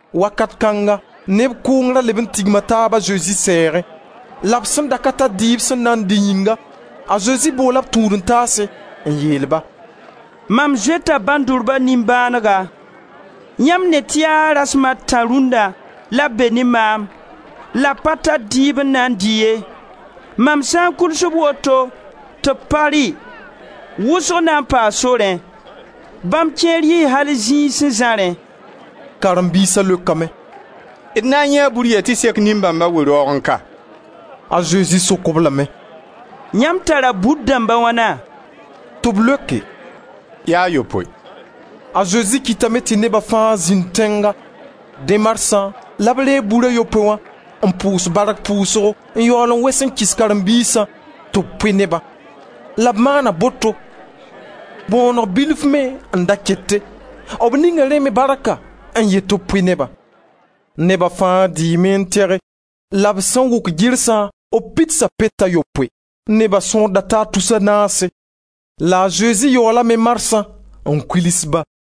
Wakat kãnga neb kʋʋng da leb n tigma taab a Zezi sɛɛgẽ. La b sẽn da ka tar dɩɩb sẽn na n dɩ yĩnga, a Zezi boola b tũud-n-taase, n yeel-ba: «Mam zoeta bãndurba nimbãanega. Yãmb ne tɩ yaa rasma a tã rũnna la b be ne maam, la b pa tar dɩɩb n na n dɩ ye. Mam sã n kuls-b woto tɩ b pa rɩ, wʋsg na n paa sorẽ. Bãmb kẽer yii al zĩig sẽn zãrẽ.» B karen-biisa leokame: «D na n yãee bur yɛ tɩ sek nin-bãmba, we-raoogẽ ka?» A Zezi sok-b lame: «Yãmb tara bur dãmb a wãna?» Tɩ b leoke: «Yaa a yopoe.» A Zezi kɩtame tɩ neba fãa zĩnd tẽnga; dẽ marsã la b reeg bur a yopoe wã n pʋʋs bark pʋʋsgo n yaool n wes n kɩs b karen-biisã tɩ b pʋɩ nebã, la b maana boto. Kʋɩl-zẽ-bõoneg bilf me n da kete. B ninga rẽ me barka n yet tɩ b pʋɩ nebã. Neba fãa dɩɩme n tɩge la b sẽn wʋk girsã b pidsa pet a yopoe. Neba sõor da taa tus a naase; la a Zezi yaoolame marsã n kuls-ba.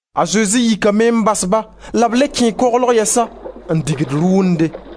A Zezi yikame n bas-ba la b le kẽe koglg yɛsa, n dig rʋʋnde.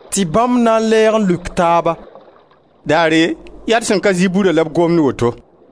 Tɩ bãmb na n lɛɛg n leok taaba: «Daare yaa d sẽn ka zɩ burã la b gomd woto.»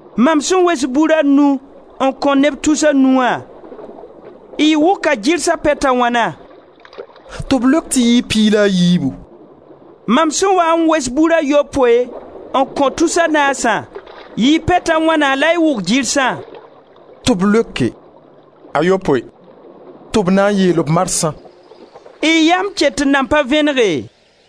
Mam sẽn wes bur a nu n kõ neb tus a nu wã, y wʋka gɩrsa pet a wãna?» Tɩ b leok tɩ yɩɩ piig la a yiibu. «Mam sẽn waa n wes bur a yopoe n kõ tus a naasã, yɩɩ pet a wãna la y wʋk gɩrsã?» Tɩ b leoke: «A yopoe.» Tɩ b na n yeel-b marsã: «Y yam ket n nan pa vẽnege?»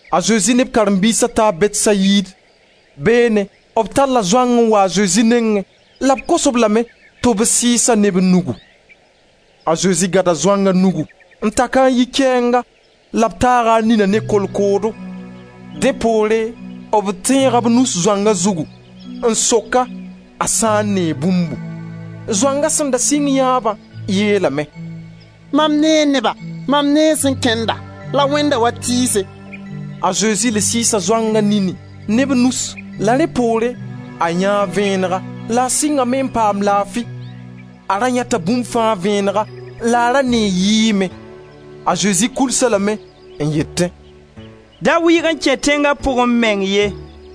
A Zezi ne b karen-biisa taa Bɛtsayid. Beene b talla zoang n wa a Zezi nengẽ la b kos-b lame tɩ b sɩɩs-a ne b nugu. A Zezi gãda zoanga nugu n tak-a n yi kɛɛnga la b taaga a nina ne kolkoodo. Dẽ poore b tẽega b nus zoanga zugu, n sok-a a sã n nee bũmbu. Zoanga sẽn da sɩng yãeeba, yeelame: «Mam nee neba, mam nee sẽn kẽnda, la wẽnda wa tɩɩse.» A Zezi le sɩɩsa zoanga nini ne b nusi la rẽ poore, a yãee vẽenega la a sɩngame n paam laafi. A ra yãeta bũmba fãa vẽenega la a ra nee yɩɩg me. A Zezi kʋls-a lame n yetẽ: «Da wɩɩg n kẽ tẽnga pʋgẽ meng ye.»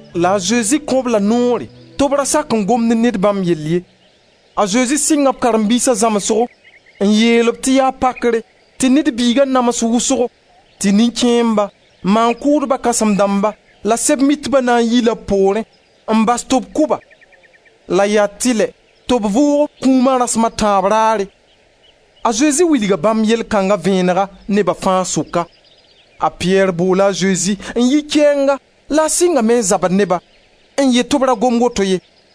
La a Zezi kõ-b la noore tɩ b ra sak n gom ne ned bãmb yell ye. A Zezi sɩnga b karen-biisa zãmsgo n yeel-b tɩ yaa pakre tɩ Ned Biiga nams wʋsgo; tɩ nin-kẽemba, maan-kʋʋdba kãsẽm dãmba la Sɛb-mitba na n yi-la b poorẽ, n bas tɩ b kʋ-ba, la yaa tɩlɛ tɩ b vʋʋg b kũuma rasma tãab raare. A Zezi wilga bãmb yell kãnga vẽenega neba fãa sʋka. A Piyɛr boola a Zezi n yi kɛɛnga la a sɩngame n zabd ne-ba, n yet tɩ b ra gom woto ye.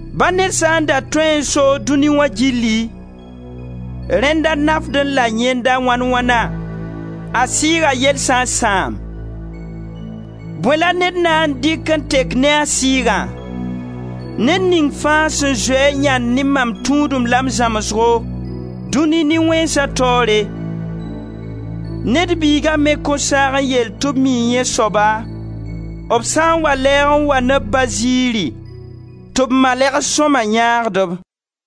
Ba ned sã n da tõeẽ n soog dũni wã gilli, rẽnda nafdẽ-la yẽnda wãn-wãna, a sɩɩga yell sã n sãam? Bõe la ned na n dɩk n tek ne a sɩɩgã? Ned ning fãa sẽn zoe-a yãnd ne mam tũudem la m zãmsgo, dũni nin-wẽnsa taoore, Ned Biiga me kõn saag n yeel tɩ b mii yẽ soaba, b sã n wa lɛɛg n wa ne b Ba ziiri tɩ b malɛgs sõma yãagd-b.»